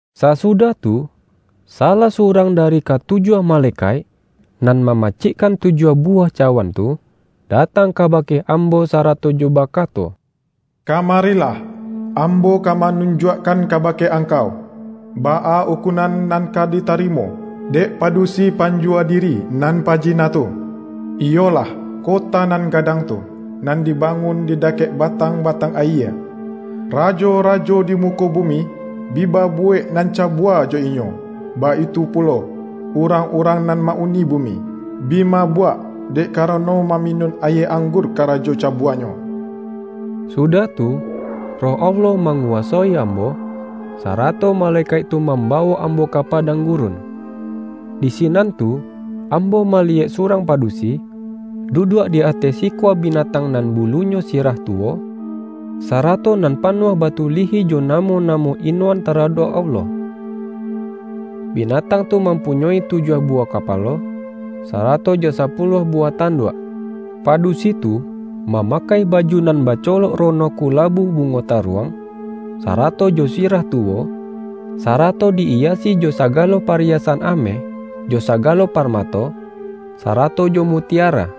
Sasudah tu, salah surang da-ri katujuah malekaik nan ma-macikkan tujuah buwah cawan tu, datang kabake ambo sarato jo baka-to,”Kamarilah, ambo ka manunjuak-kan kabake angkau, baa ukunan nan ka ditarimo, dek padusi panjuwa di-ri nan pajina tu, iyolah, kota nan ga-dang tu, nan dibangun di dakek ba-tang-batang ayie. Rajo-rajo di muko bumi, bi babuwek nan cabua jo inyo, baitu pulo, urang-urang nan ma-uni bumi, bi mabuak, dek karano mami-nun ayie anggur karajo cabuanyo.” Sudah tu, Roh Allah manguwa-soi ambo, sarato malekaik tu mam-bawok ambo ka padang gurun. Di si-nan tu ambo maliyek surang padusi, duduak di ateh sikua binatang nan bulunyo sirah tuwo, sarato nan pa-nuah batulihi jo namo-namo inoan taradok Allah. Binatang tu mampu-nyoi tujuah buwah kapalo, sarato jo sapuluah buwah tanduak. Padusi tu, mamakai baju nan bacolok rono kula-bu bungo taruang, sarato jo sirah tu-wo, sarato di-iyasi jo sagalo pariya-san ameh, jo sagalo parmato, sarato jo mutiara.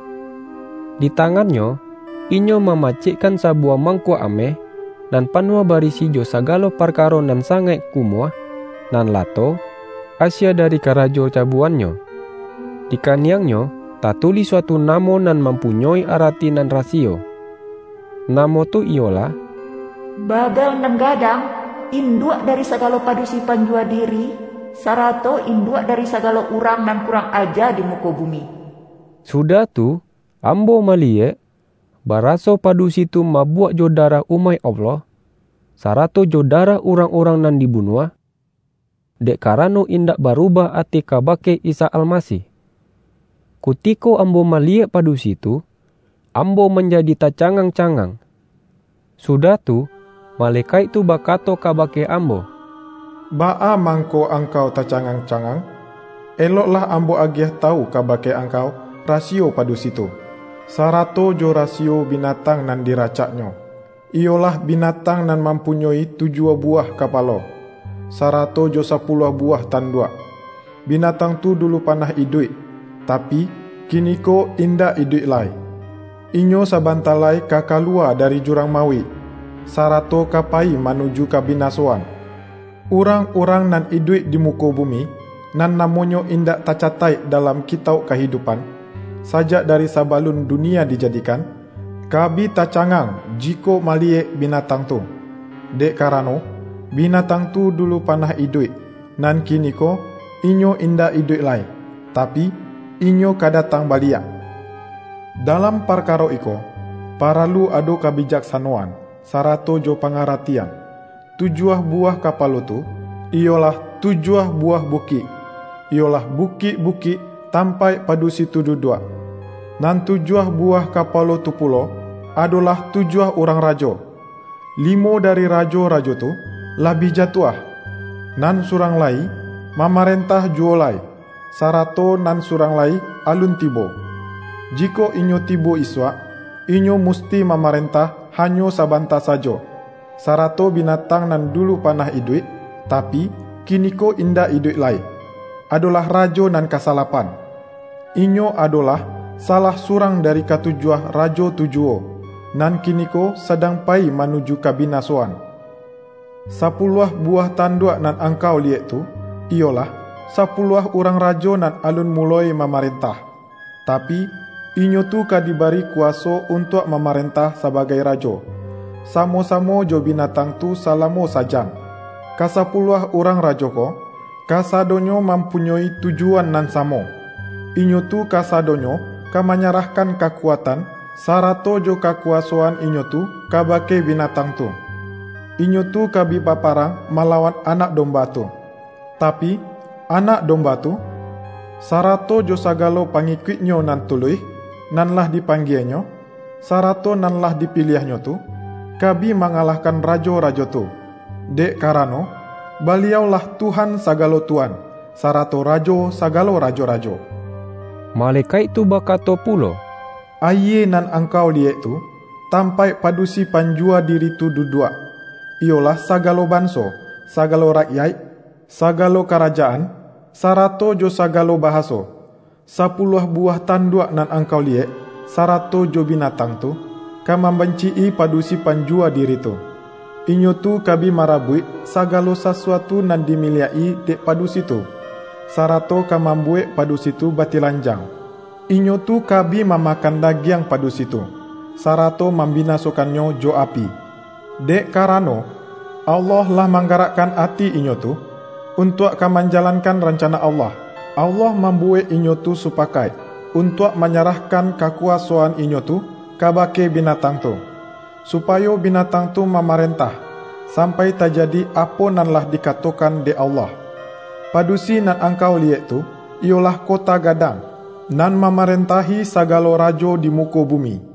Di tangannyo, inyo ma-macikkan sabuwah mangkuak ameh, nan panuah barisi jo sagalo parkaro nan sangaik kumuah, nan lato, asie dari karajo cabuanyo. Di kaniang-nyo, tatulih suatu namo nan mampu-nyoi arati nan rasiyo. Namo tu iyolah”Babel Nan Gadang, induak dari sa-galo padusi panjuwa diri, sarato in-duak dari sagalo urang nan kurang aja di muko bumi.” Sudah tu, am-bo maliyek, baraso padusi tu mabuak jo darah umaik Allah, sarato jo da-rah urang-urang nan dibunuah, dek karano indak barubah ati kabake Isa Almasih. Kutiko ambo maliyek padusi tu, ambo manjadi tacangang-cangang. Sudah tu, malekaik tu bakato kaba-ke ambo,”Baa mangko angkau taca-ngang-cangang? Eloklah ambo agiah tawu kabake angkau rasiyo padusi tu, sarato jo rasiyo binatang nan di-racaknyo, iyolah binatang nan mam-punyoi tujuah buwah kapalo, sarato jo sapuluah buwah tanduak. Bina-tang tu dulu panah iduik, tapi, kini-ko indak iduik lai. Inyo sabanta lai ka kaluwa dari jurang mauik, sarato ka payi manuju kabinasoan. Urang-urang nan iduik di muko bumi, nan namonyo indak tacataik dalam Kitauk Kahidupan, sajak dari sabalun dunia dijadikan, ka bi tacangang jikok ma-liyek binatang tu. Dek karano, bina-tang tu dulu panah iduik. Nan kiniko inyo indak iduik lai, tapi, inyo ka da-tang baliak. Dalam parkaro iko, paralu ado ka-bijaksanoan, sarato jo pangaratian. Tujuah buwah kapalo tu, iyolah tu-juah buwah bukik; iyolah bukik-bu-kik tampaik padusi tu duduak. Nan tujuah buwah kapalo tu pulo, adolah tujuah urang rajo: Limo dari rajo-rajo tu, lah bi jatuah, nan surang la-yi mamarentah juwo lai, sarato nan surang lai alun tibo. Jikok inyo tibo isuak, inyo musti mamarentah hanyo sabanta sajo. Sarato binatang nan dulu panah iduik, tapi, kiniko indak iduik lai, adolah rajo nan kasalapan. Inyo adolah salah surang dari katu-juah rajo tu juwo, nan kiniko sadang payi manuju kabinasoan. Sapuluah buwah tanduak nan angkau liyek tu, iyolah, sapuluah urang rajo nan alun muloi mamaren-tah. Tapi, inyo tu ka dibari kuwaso untuak mamarentah sabagai rajo, sa-mo-samo jo binatang tu salamo sa-jam. Kasapuluah urang rajo ko, kasadonyo mampunyoi tujuan nan sa-mo; inyo tu kasadonyo ka manyarah-kan kakuatan, sarato jo kakuwasoan inyo tu kabake binatang tu. Inyo tu ka bi baparang malawan Anak Dom-ba tu. Tapi, Anak Domba tu, sarato jo sagalo pangikuik-Nyo nan tuluih, nan lah dipanggie-Nyo, sarato nan lah dipiliah-Nyo tu, ka bi mangalah-kan rajo-rajo tu, dek karano, Baliau-lah Tuhan sagalo tuan, sarato Rajo sa-galo rajo-rajo.” Malekaik tu bakato pulo,”Ayie nan angkau liyek tu, tampaik padusi panjuwa diri tu duduak, iyolah saga-lo banso, sagalo rakyaik, sagalo kara-jaan, sarato jo sagalo bahaso. Sa-puluah buwah tanduak nan angkau liyek, sarato jo binatang tu, ka mam-banci-i padusi panjuwa diri tu. Inyo tu ka bi marabuik sagalo sasuatu nan dimiliak-i dek padusi tu, sarato ka mambuwek padusi tu batilanjang. Inyo tu ka bi mamakan dagiang padu-si tu, sarato mambinasokannyo jo api. Dek karano, Allah lah manggarak-kan ati inyo tu, untuak ka manjalan-kan rancana Allah. Allah mambuwek inyo tu supakaik, untuak manyarah-kan kakuwasoan inyo tu kabake bi-natang tu, supayo binatang tu ma-marentah, sampai tajadi apo nan lah dikatokan dek Allah. Padusi nan angkau liyek tu, iyo-lah kota gadang, nan mamarentahi sagalo rajo di muko bumi.”